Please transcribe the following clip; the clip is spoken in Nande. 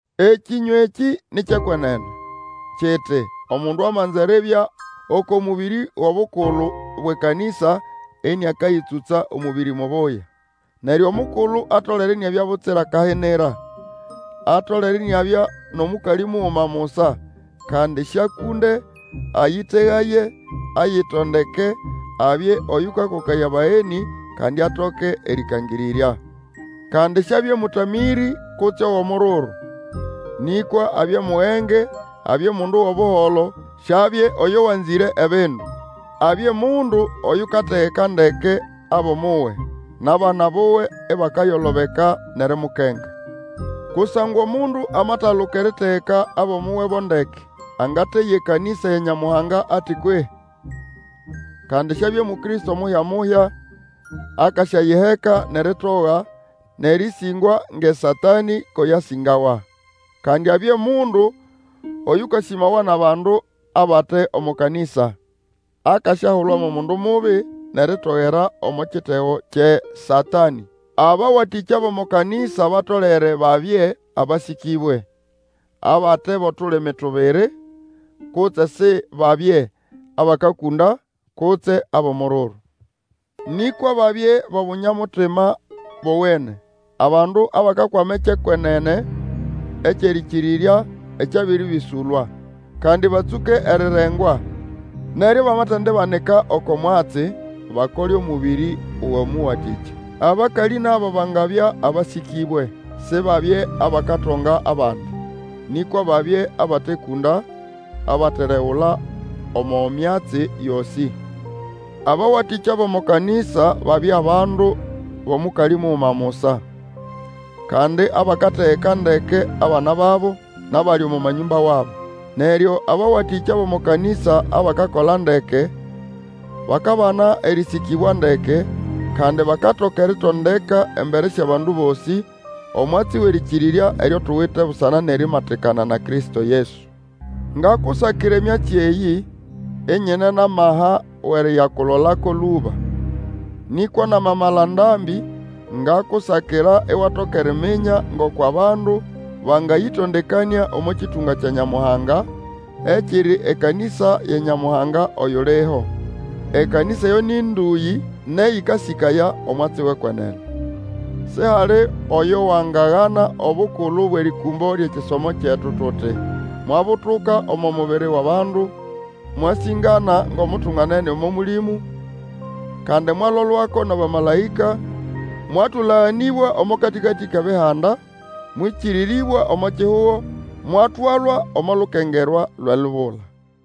Ekĩnywa ekĩ ni kyʼekwenene, kiti, Omundu amanza eribya oko mũbĩrĩ wʼobukulu bwʼekanĩsa, ĩnĩakayĩtsũtsa omũbĩrĩ mubuya. Neryo omukulu, atolere iniabya butsira kahinira, atolere iniabya nʼomũkalĩ muguma musa, kandi sĩakũnde, ayĩtegaye, ayitondeke, abye oyũkakokaya abagenĩ, kandi atoke erĩkangĩrĩrya. Kandi siabye mũtamĩrĩ, kutse owʼomururu, nĩkwa abye mugenge, abye mundu wʼobuholo, siabye oyo wanzĩre ebindu. Abye mundu oyukategeka ndeke abʼomuwe, nʼabana buwe ibakayolobeka nʼerimukenga. Kusangwa omundu amataluka eritegeka abʼomuwe bo ndeke, angateya ekanĩsa ya Nyamuhanga ati kwehĩ? Kandi syabye Mukristo muhya-muhya, akasyayiheka nʼeritoga, nʼerĩsĩngwa ngʼeSatanĩ ko yasĩngawa. Kandi abye mundu Oyũkasĩmawa nʼabandu abate omo kanĩsa, akasyahulwa mo mundu mubi, nʼeritogera omo kitego kyʼeSatanĩ. Abawatĩkya bʼomo kanĩsa batolere babye abasĩkĩbwe, abate bʼotulimi tubiri, kutse Sibabye abakakũnda, kutse abʼomururu. Nĩkwa babye bʼobunya-mutima bowene, abandu abakakwama ekyʼekwenene ekyʼerĩkĩrĩrya, ekyabĩrĩbĩsũlwa. Kandi batsũke erirengwa, neryo bamatendibanika oko mwatsi, bakole omũbĩrĩ wʼomũwatĩkya. Abakalĩ nabo bangabya abasĩkĩbwe, Sibabye abakatonga abandi, nĩkwa babye abatekũnda, abateregula omo myatsi yosĩ. Abawatĩkya bʼomo kanĩsa babye abandu bʼomũkalĩ muguma musa, kandi abakategeka ndeke abana babo, nʼabali omo manyũmba wabo. Neryo abawatĩkya bʼomo kanĩsa abakakola ndeke bakabana erĩsĩkĩbwa ndeke, kandi bakatoka eritondeka embere syʼabandu bosĩ omwatsi wʼerĩkĩrĩrya eryo tuwite busana nʼerimatikana na Kristo Yesu. Ngakusakira emyatsi eyĩ, inyine nʼamaha wʼeriyakulolako lũba. Nĩkwa namamala ndambĩ, ngakusakira iwatoka eriminya ngoko abandu bangayĩtondekanĩa omo kĩtũnga kya Nyamuhanga, ekiri ekanĩsa ya Nyamuhanga oyuliho. Ekanĩsa eyo nĩ ndũyĩ nʼeyĩkasĩkaya omwatsi wʼekwenene. Sihali oyo wangagana obukulu bwʼerĩkũmbo lyʼekisomo kyetu tuti, Mwabutuka omo mubiri wʼabandu, Mwasĩngana ngʼomutunganene omo Mũlĩmũ, Kandi mwalolwako nʼabamalaĩka, Mwatũlaganĩbwa omo katĩkatĩ kʼebihanda, Mwĩkĩrĩrĩbwa omo kihugo, Mwatwalwa omo lukengerwa lwʼelubula.